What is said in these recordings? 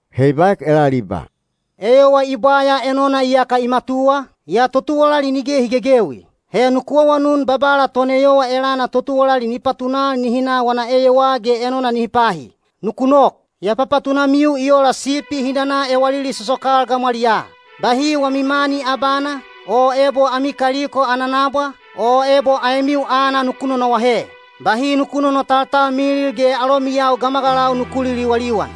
He i baek elal i ba, “Eyowa i bwaya enona iyaka i matuwa, yaa totuwalali nige hi gegewi. He nuku awanun Babala toneyowa elana totuwalali ni patunal nihi na wana eyowaa ge enona nihi pahi. Nuku nok. Ya papatunamiu i ola sipi hi nana ewalili sosokal gamwaliyaa. Bahi wami mani abana, o ebo ami kaliko ana nabwa, o ebo aemiu aana nuku nonoahe. Bahi nuku nonotaltalmilil ge alomiyau gamagalau nuku liliwaliwan.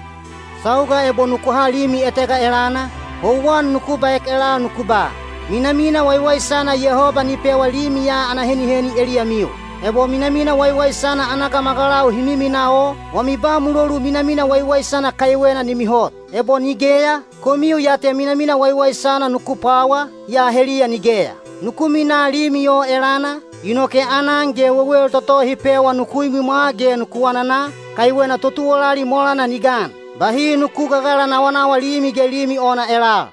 Sauga ebo nuku ha limi etega elana, houwan nuku baek elal nuku ba, ‘Minamina waiwaisana Yehoba ni pewa limi ya ana heniheni eliyamiu.’ Ebo minamina waiwaisana ana gamagalau hi miminaa o, wami ba mulolu minamina waiwaisana kaiwena ni mihot. Ebo nigeya, komiu ya te minamina waiwaisana nuku pwawa, yaa heliya nigeya. Nuku minaa limi o elana, inoke aanan ge wewel toto hi pewa nuku imwimwa ge nuku anana, kaiwena totuwalali molana ni gan. Bahi nuku gagalanawanawa limi ge limi ona elal.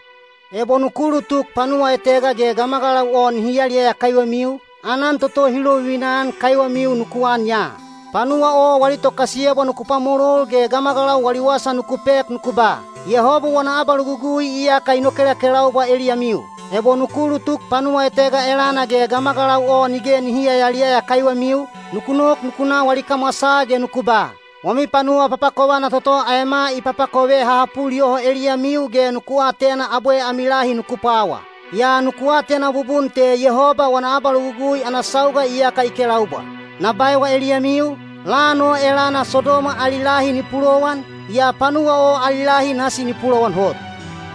Ebo nuku ulutuk panuwa etega ge gamagalau o nihi yaliyaya kaiwemiu, aanan toto hi lovivina-an kaiwemiu nuku an ya. Panuwa o wali tokasiyebwa nuku pwamolol ge gamagalau wali wasa nuku pek nuku ba, ‘Yehoba wana abalogugui iyaka i nokelakelaubwa eliyamiu.’ Ebo nuku ulutuk panuwa etega elana ge gamagalau o nige nihi yayaliyaya kaiwemiu, nuku nok nuku na wali kamwasaa ge nuku ba, ‘Wami panuwa papakovana toto aema i papakove ha hapul yoho eliyamiu ge nuku atena abwe ami lahi nuku pwawa. Yaa nuku atena bubun te Yehoba wana abalogugui ana sauga iyaka i kelaubwa.’ Na baewa eliyamiu, lan o elana Sodoma ali lahi ni pulowan, yaa panuwa o ali lahi nasi ni pulowan hot.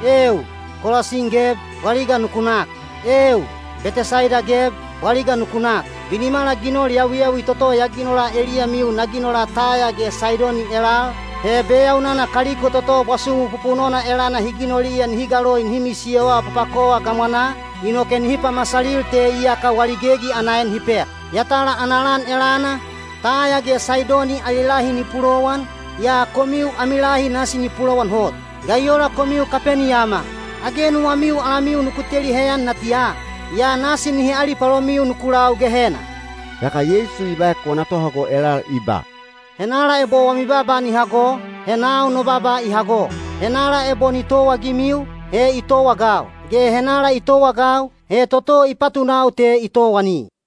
Eeu! Kolasin geb, bwaliga nuku nak! Eeu! Betesaida geb, bwaliga nuku nak! Binimala ginol yawiyawi toto ya ginola eliyamiu na ginola Taya ge Saidoni elal, he beyaunana kaliko toto bwasumu pupunona elana hi ginoliya nihi galoi nihi misiyowa papakova gamwanaa, inoke nihi pamasalil te iyaka wali gegi ana en hi pek. Yatala ana lan elana, Taya ge Saidoni ali lahi ni pulowan, yaa komiu ami lahi nasi ni pulowan hot. Ga i ola komiu Kapeniyama! Age nuwamiu alamiu nuku teli heyan natiya? Yaa nasi nihi alipalomiu nuku lau Gehena.” Yaka Yeisu i baek wana tohago elal i ba, “Henala ebo wami baaba ni hago, he nau no baaba i hago. Henala ebo ni towaagimiu, he i towaagau, ge henala i towaagau, he toto i patunau te i towani.”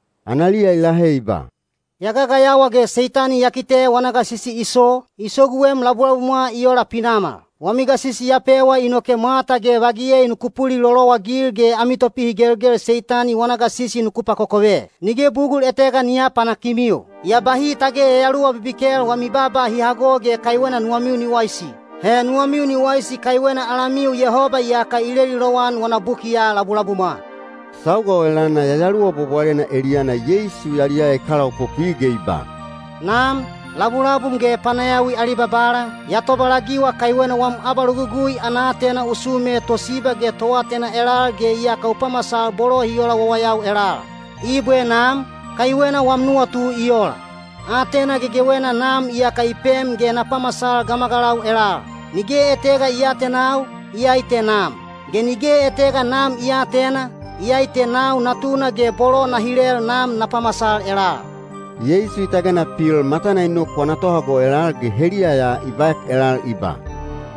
Analiya i lahe i ba, “Ya gagayawa ge Seitani ya kite wana gasisi i so, i soguem labulabumwa i ola pinamal. Wami gasisi ya pewa inoke mwata ge vagiyei nuku pulilolowagil ge ami topihigelgel Seitani wana gasisi nuku pakokove; nige bugul etega ni aapanakimiu. Yaa bahi tage yayaluwa bibikel wami baaba hi hago ge kaiwena nuwamiu ni waisi. He nuwamiu ni waisi kaiwena alamiu Yehoba iyaka i leli lowan wana bukiya labulabumwa.” Sauga o elana Yayaluwa Bwabwalena eliyana Yeisu yaliyaya i kalaopopwi ge i ba, “Nam, labulabum ge panayawi ali Babala, ya tobalagiwa kaiwena wam abalogugui ana aatena u sume tosiba ge toatena elal ge iyaka u pamasal bolo hi ola wawayau elal. Ibwe Nam, kaiwena wam nuwatu i ola. “Aatena gegewena Nam iyaka i pem ge na pamasal gamagalau elal. Nige etega i aatenau, iyai te Nam, ge nige etega Nam i aatena, iyai te nau Natuna ge bolo na hilel Nam na pamasal elal.” Yeisu i tagena pil matana i nok wana tohago elal ge heliya ya i baek elal i ba,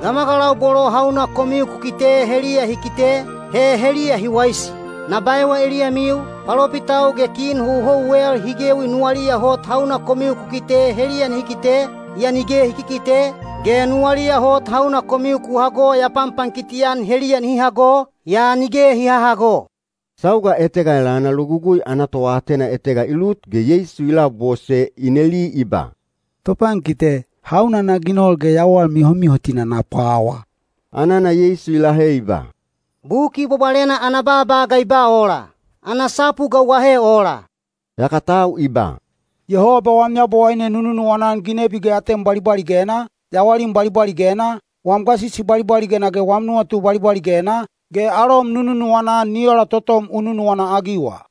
“Gamagalau bolo hauna komiu ku kite heliya hi kite, he heliya hi waisi. Na baewa eliyamiu, palopitau ge kin houhouwel hi gewi nuwaliya hot hauna komiu ku kite heliya nihi kite, yaa nige hi kikite, ge nuwaliya hot hauna komiu ku hago ya panpankiti-an heliya nihi hago, yaa nige hi hahago.” Sauga etega elana Logugui ana toatena etega i lut ge Yeisu i labose i neli i ba, “Topankite, hauna na ginol ge yawal mihomihotina na pwawa?” Anana Yeisu i lahe i ba, “Buki Bwabwalena ana baaba ga i ba ola? Ana sapu ga u ahe ola?” Yaka tau i ba, “‘Yehoba wam Yabowaine nu nunuwana-an ginebi ge atem bwalibwaligena, yawalim bwalibwaligena, wam gasisi bwalibwaligena ge wam nuwatu bwalibwaligena,’ ge ‘Alom nu nunuwana-an ni ola totom u nunuwana-agiwa.’”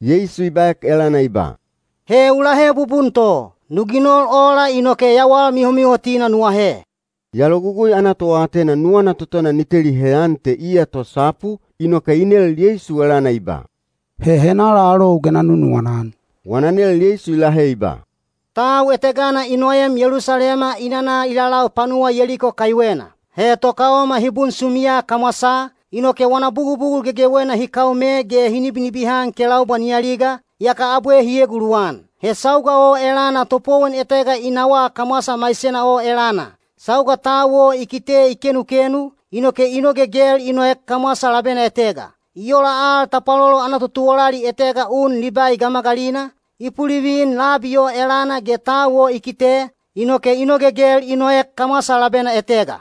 Yeisu i baek elana i ba, “He u lahe bubun to. Nu ginol ola inoke yawal mihomihotina nu ahe.” Yaa Logugui ana toatena nuwana totona ni teli heyan te iya tosapu, inoke i nel Yeisu elana i ba, “He henala alou ge na nunuwana-an?” Wana nel Yeisu i lahe i ba, “Tau etegana i noem Yelusalema i nana i lalau panuwa Yeliko kaiwena. He tokaoma hi bunsumiya kamwasaa, inoke wana bugubugul gegewena hi kaome ge hi nibinibihan kelaubwa ni aliga, yaka abwe hi eguluwan. He sauga o elana topowon etega i nawaa kamwasa maisena o elana. Sauga tau o i kite i kenukenu, inoke i nogegel i noek kamwasa labena etega. I ola al tapwalolo ana totuwalali etega un Libai gamagalina, i pulivin labi o elana ge tau o i kite, inoke i nogegel i noek kamwasa labena etega.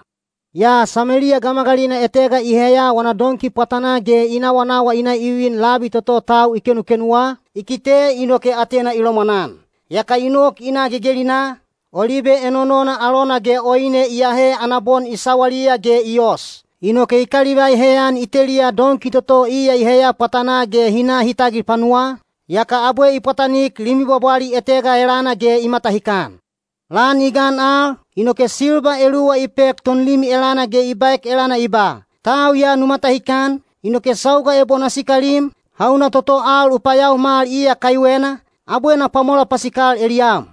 Yaa Sameliya gamagalina etega i heya wana donki pwatanaa ge i nawanawa i na i vin labi toto tau i kenukenuwa, i kite inoke atena i lomwanan. Yaka i nok i na gegelinaa, olibe enonona alona ge oine i ahe ana bon i sawaliya ge i os. Inoke i kalivai heyan i teliya donki toto iya i heya pwatanaa ge hi na hi tagil panuwaa, yaka abwe i pwatanik limi bwabwali etega elana ge i matahikan. Lan i gan al, inoke silba eluwa i pek tonlimi elana ge i baek elana i ba, ‘Tau ya nu matahikan, inoke sauga ebo na sikalim, hauna toto al u payaomal iya kaiwena, abwe na pwamola pasikal eliyam.’”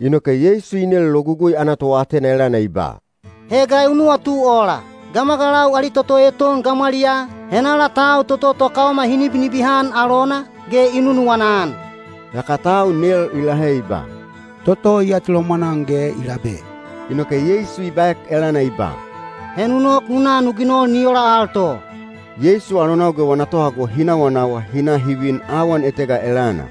Inoke Yeisu i nel Logugui ana toatena elana i ba, “He ga u nuwatu ola? Gamagalau ali toto eton gamwaliyaa, henala tau toto tokaoma hi nibinibihan alona, ge i nunuwana-an?” Yaka tau nel i lahe i ba, “Toto i atilomwan-an ge i labe.” Inoke Yeisu i baek elana i ba, “He nu nok nu na nu ginol ni ola al to.” Yeisu alonau ge wana tohago hi nawanawa hi na hi vin awan etega elana.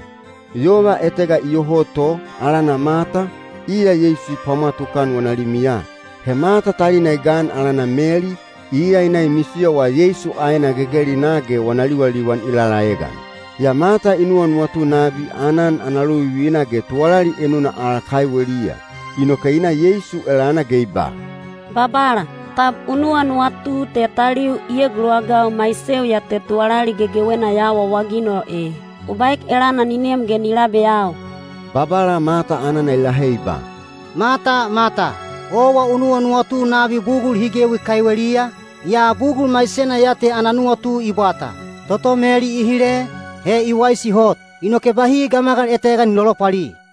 Yova etega iyoho to, alana Mata, iya Yeisu i pwamwa tukan wana limiya. He Mata talina i gan alana Meli, iya i na i misiyowa Yeisu aena gegelinaa ge wana liwaliwan i lalaegan. Yaa Mata i nuwanuwatu nabi aanan ana lovivina ge tuwalali enuna al kaiweliya. Inoke i na Yeisu elana ge i ba, “Babala, tab u nuwanuwatu te taliu i eguluwagau maiseu ya te tuwalali gegewena ya awaawaginol e? U baek elana ni nem ge ni labeyau.” Babala Mata anana i lahe i ba, “Mata, Mata, owa u nuwanuwatu nabi bugul hi gewi kaiweliya, yaa bugul maisena ya te ana nuwatu i bwata. Toto Meli i hile, he i waisi hot, inoke bahi gamagal etega ni lolopwali.”